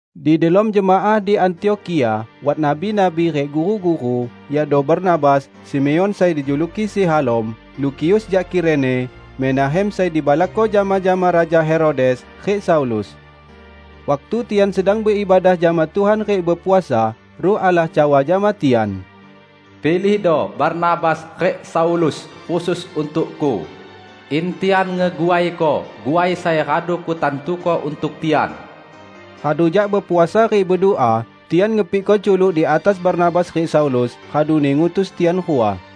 Di delom jemaah di Antiokhia wat nabi-nabi rik guru-guru, yakdo Barnabas, Simeon sai dijuluki Si Halom, Lukius jak Kirene, Menahem sai dibalakko jama-jama Raja Herodes, rik Saulus. Waktu tian sedang beibadah jama Tuhan rik bepuasa, Ruh Allah cawa jama tian, "Pilihdo Barnabas rik Saulus khusus untuk-Ku, in tian ngeguaiko guai sai radu Kutantuko untuk tian." Radu jak bepuasa rik bedua tian ngepikko culuk di atas Barnabas rik Saulus raduni ngutus tian rua.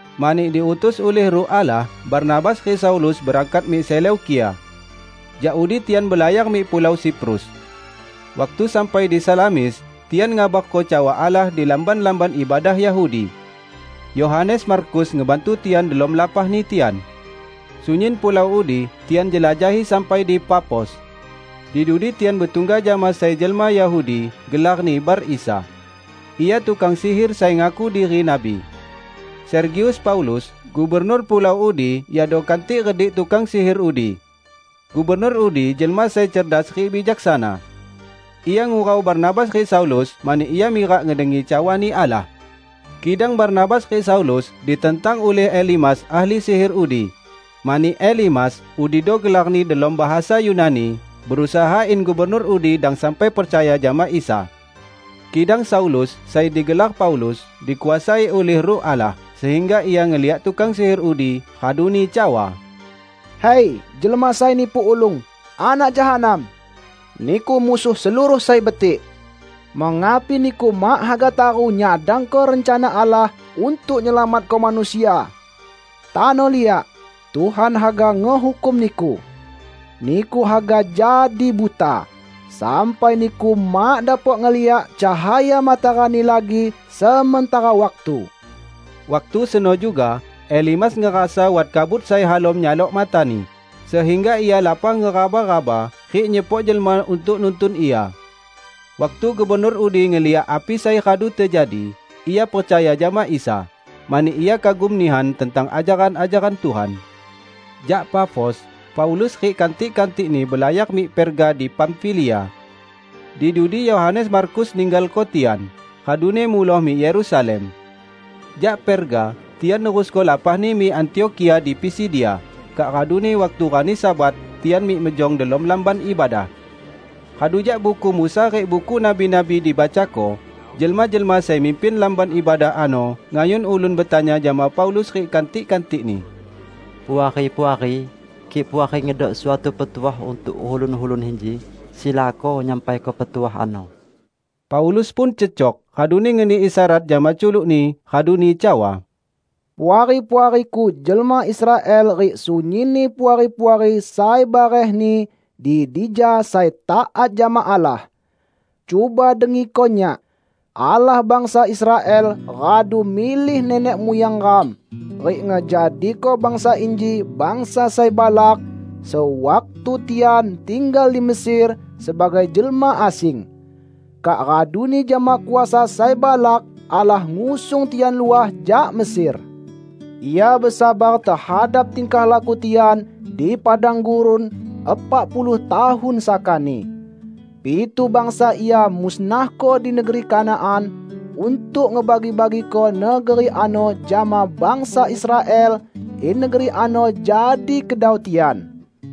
Mani diutus ulih Ruh Allah, Barnabas rik Saulus berangkat mik Seleukia. Jak udi tian belayar mik pulau Siprus. Waktu sampai di Salamis, tian ngabarko cawa Allah di lamban-lamban ibadah Yahudi. Yohanes Markus ngebantu tian delom lapahni tian. Sunyin pulau udi tian jelajahi sampai di Pafos. Di dudi tian betungga jama sai jelma Yahudi, gelarni Bar Isa. Ia tukang sihir sai ngaku diri nabi. Sergius Paulus, gubernur pulau udi yakdo kantik redik tukang sihir udi. Gubernur udi jelma sai cerdas rik bijaksana. Ia ngurau Barnabas rik Saulus mani ia mirak ngedengi cawani Allah. Kidang Barnabas rik Saulus ditentang ulih Elimas ahli sihir udi, mani Elimas (udido gelarni delom bahasa Yunani) berusaha in gubernur udi dang sampai percaya jama Isa. Kidang Saulus -- sai digelar Paulus -- dikuasai ulih Ruh Allah, sehingga ia ngeliak tukang sihir udi, raduni cawa, "Hai, jelma sai nipu ulung, anak jahanam! Niku musuh seluruh sai betik. Mengapi niku mak haga taru nyadangko rencana Allah untuk nyelamatko manusia? Tano liak, Tuhan haga ngehukum niku! Niku haga jadi buta, sampai niku mak dapok ngeliak cahaya matarani lagi sementara waktu." Waktu seno juga Elimas ngerasa wat kabut sai halom nyalok matani, sehingga ia lapah ngeraba-raba rik nyepok jelma untuk nuntun ia. Waktu gubernur udi ngeliak api sai radu tejadi, ia percaya jama Isa; mani ia kagum nihan tentang ajaran-ajaran Tuhan. Jak Pafos, Paulus rik kantik-kantikni belayar mik Perga di Pamfilia. Di dudi Yohanes Markus ninggalko tian, raduni muloh mik Yerusalem. Jak Perga, tian nerusko lapahni mik Antiokhia di Pisidia, kak raduni waktu rani Sabat tian mik mejong delom lamban ibadah. Radu jak Buku Musa rik Buku Nabi-nabi dibacako, jelma-jelma sai mimpin lamban ibadah ano ngayun ulun betanya jama Paulus rik kantik-kantikni, "Puari-puari, kik Puari ngedok suatu petuah untuk ulun-ulun inji, silako nyampaiko petuah ano." Paulus pun cecok, raduni ngeni isyarat jama culukni, raduni cawa, "Puari-puariku jelma Israel rik sunyinni puari-puari sai barehni di dija sai taat jama Allah! Cuba dengiko nyak: Allah bangsa Israel radu milih nenek muyang ram, rik ngejadiko bangsa inji bangsa sai balak sewaktu tian tinggal di Mesir sebagai jelma asing. Kak raduni jama kuasa sai balak Allah ngusung tian luah jak Mesir. Ia besabar tehadap tingkah laku tian di padang gurun epak puluh tahun sakani. Pitu bangsa Ia musnahko di negeri Kanaan untuk ngebagi-bagiko negeri ano jama bangsa Israel in negeri ano jadi kedau tian.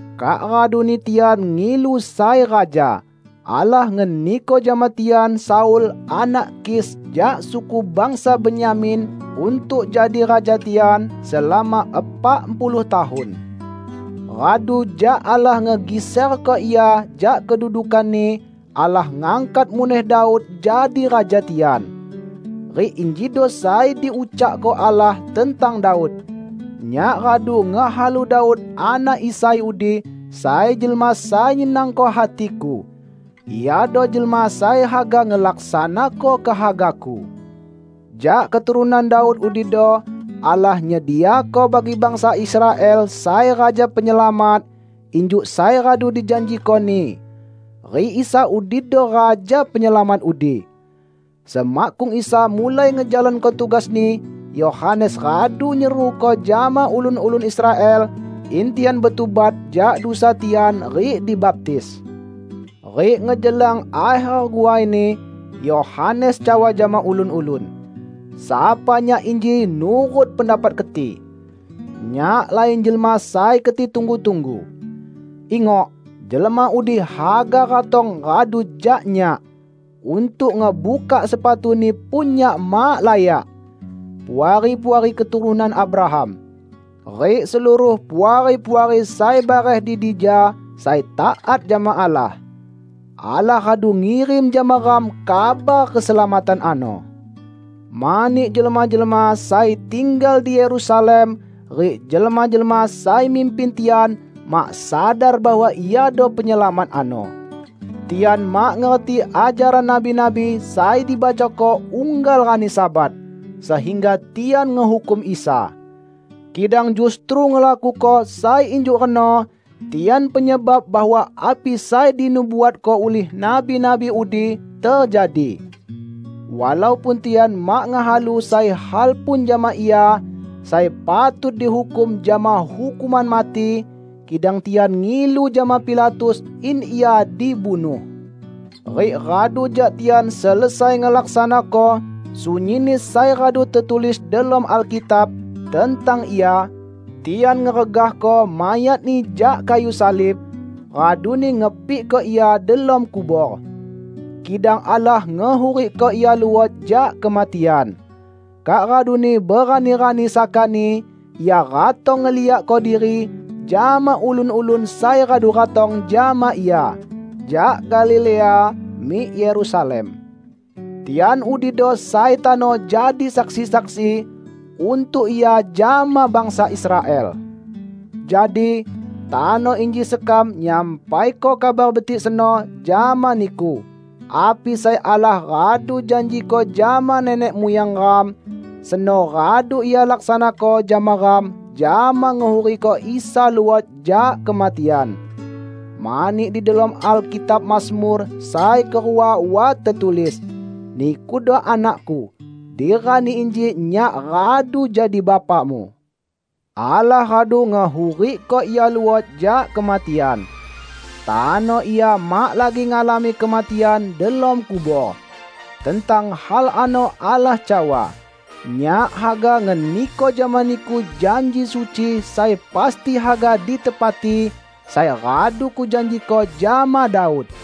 Kak raduni tian ngilu sai raja. Allah ngeniko jama tian Saul anak Kis jak suku bangsa Benyamin untuk jadi raja tian selama epak puluh tahun. Radu jak Allah ngegiserko ia jak kedudukanni, Allah ngangkat muneh Daud jadi raja tian. Rik injido sai diucakko Allah tentang Daud, 'Nyak radu ngehalu Daud anak Isai udi sai jelma sai nyenangko hati-Ku. Iado jelma sai haga ngelaksanako kehaga-Ku!' Jak keturunan Daud udido Allah nyediako bagi bangsa Israel sai Raja Penyelamat, injuk sai radu dijanjiko-Ni. Rik Isa udido Raja Penyelamat udi. Semakkung Isa mulai ngejalanko tugas-Ni, Yohanes radu nyeruko jama ulun-ulun Israel, in tian betubat jak dusa tian rik dibaptis. Rik ngejelang akher guaini, Yohanes cawa jama ulun-ulun, 'Sapa nyak inji nurut pendapat keti? Nyak lain Jelma sai keti tunggu-tunggu. Ingok, Jelma udi haga ratong radu jak nyak; untuk ngebukak sepatu-Ni pun nyak mak layak!' Puari-puari keturunan Abraham, rik seluruh Puari-puari sai bareh di dija sai taat jama Allah! Allah radu ngirim jama ram kabar keselamatan ano; mani jelma-jelma sai tinggal di Yerusalem rik jelma-jelma sai mimpin tian mak sadar bahwa Iado penyelamat ano. Tian mak ngerti ajaran nabi-nabi sai dibacako unggal rani Sabat, sehingga tian ngehukum Isa. Kidang justru ngelakuko sai injuk reno tian penyebab bahwa api sai dinubuatko ulih nabi-nabi udi tejadi. Walaupun tian mak ngehalu sai hal pun jama Ia sai patut dihukum jama hukuman mati, kidang tian ngilu jama Pilatus in Ia dibunuh. Rik radu jak tian selesai ngelaksanako sunyinni sai radu tetulis delom Alkitab tentang Ia, tian ngeregahko mayat-Ni jak kayu salib, raduni ngepikko Ia delom kubor. Kidang Allah ngehurikko Ia luot jak kematian. Kak raduni berani-rani sakani Ia ratong ngeliakko diri jama ulun-ulun sai radu ratong jama Ia jak Galilea mik Yerusalem. Tian udido sai tano jadi saksi-saksi untuk Ia jama bangsa Israel. Jadi, tano inji sekam nyampaiko Kabar Betik seno jama niku: Api sai Allah radu janjiko jama nenek muyang ram, seno radu Ia laksanako jama ram jama ngehurikko Isa luot jak kematian. Mani di delom Alkitab Mazmur sai kerua wat tetulis, 'Nikudo Anak-Ku, di rani inji Nyak radu jadi Bapa-Mu.' Allah radu ngehurikko Ia luot jak kematian. Tano Ia mak lagi ngalami kematian delom kubor. Tentang hal ano Allah cawa, 'Nyak haga ngeniko jama Niku janji suci sai pasti haga ditepati, sai radu Kujanjiko jama Daud.'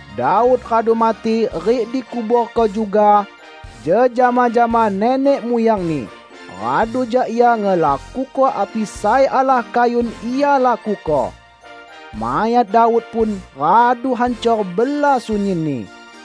Daud radu mati rik dikuborko juga jejama jama nenek muyangni, radu jak ia ngelakuko api sai Allah kayun ia lakuko. Mayat Daud pun radu hancor bela sunyinni.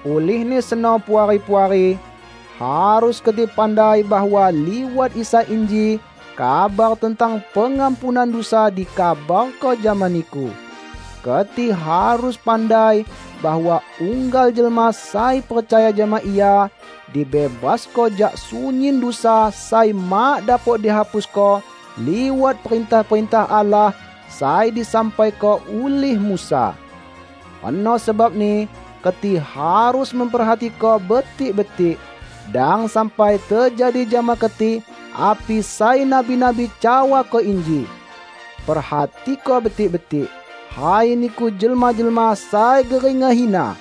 Ulihni seno Puari-puari, harus keti pandai bahwa liwat Isa inji kabar tentang pengampunan dusa dikabarko jama niku; keti harus pandai bahwa unggal jelma sai percaya jama Ia, dibebasko jak sunyin dusa sai mak dapok dihapusko liwat perintah-perintah Allah sai disampaiko ulih Musa. Reno sebabni keti harus memperhatiko betik-betik, dang sampai tejadi jama keti api sai nabi-nabi cawako inji, 'Perhatiko betik-betik, hai niku jelma-jelma sai gering ngehina!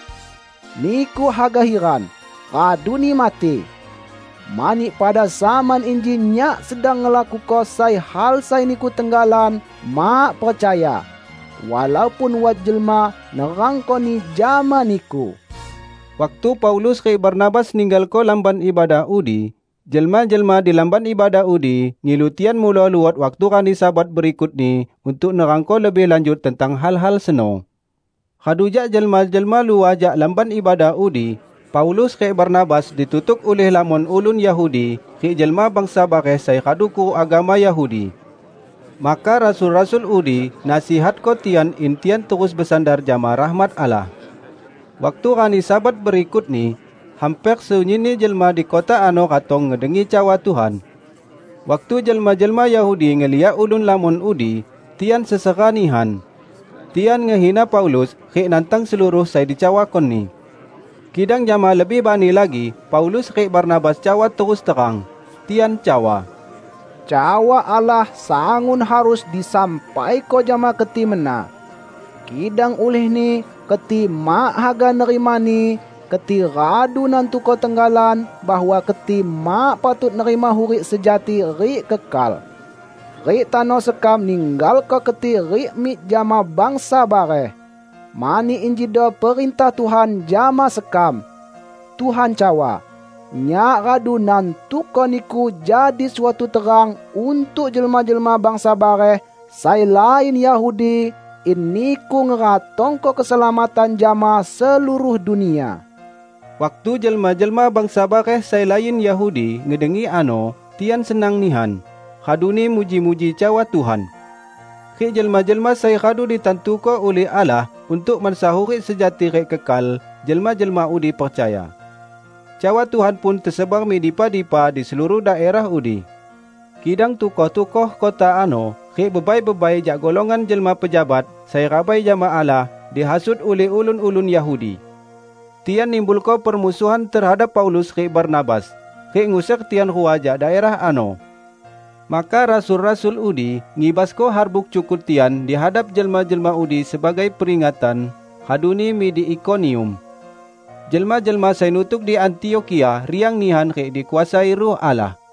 Niku haga hiran, raduni mati! Mani pada zaman inji Nyak sedang ngelakuko sai hal sai niku tenggalan mak percaya, walaupun wat jelma nerangkoni jama niku.' " Waktu Paulus rik Barnabas ninggalko lamban ibadah udi, jelma-jelma di lamban ibadah udi ngilu tian muloh luot waktu rani Sabat berikutni, untuk nerangko lebih lanjut tentang hal-hal seno. Radu jak jelma-jelma luah jak lamban ibadah udi, Paulus rik Barnabas ditutuk ulih lamon ulun Yahudi rik jelma bangsa bareh sai radu kuruk agama Yahudi. Maka rasul-rasul udi nasihatko tian in tian terus besandar jama rahmat Allah. Waktu rani Sabat berikutni, hamper sunyinni jelma di kota ano ratong ngedengi cawa Tuhan. Waktu jelma-jelma Yahudi ngeliak ulun lamon udi, tian sesera nihan. Tian ngehina Paulus rik nantang seluruh sai dicawakoni. Kidang jama lebih bani lagi Paulus rik Barnabas cawa terus terang. Tian cawa, "Cawa Allah sangun harus disampaiko jama keti mena. Kidang ulihni keti mak haga nerimani, keti radu nantuko tenggalan bahwa keti mak patut nerima hurik sejati rik kekal. Rik tano sekam ninggalko keti rik mik jama bangsa bareh. Mani injido perintah Tuhan jama sekam; Tuhan cawa, 'Nyak radu nantuko niku jadi suatu terang untuk jelma-jelma bangsa bareh sai lain Yahudi, in niku ngeratongko keselamatan jama seluruh dunia.' " Waktu jelma-jelma bangsa bareh sai lain Yahudi ngedengi ano, tian senang nihan, raduni muji-muji cawa Tuhan. Rik jelma-jelma sai radu ditantuko ulih Allah untuk mansa hurik sejati rik kekal, jelma-jelma udi percaya. Cawa Tuhan pun tesebar mik dipa-dipa di seluruh daerah udi. Kidang tukoh-tukoh kota ano rik bebai-bebai jak golongan jelma pejabat sai rabai jama Allah, dihasut ulih ulun-ulun Yahudi. Tian nimbulko permusuhan tehadap Paulus rik Barnabas, rik nguser tian rua jak daerah ano. Maka rasul-rasul udi ngibasko harbuk cukut tian di hadap jelma-jelma udi sebagai peringatan, raduni mik di Ikonium. Jelma-jelma sai nutuk di Antiokhia riang nihan rik dikuasai Ruh Allah.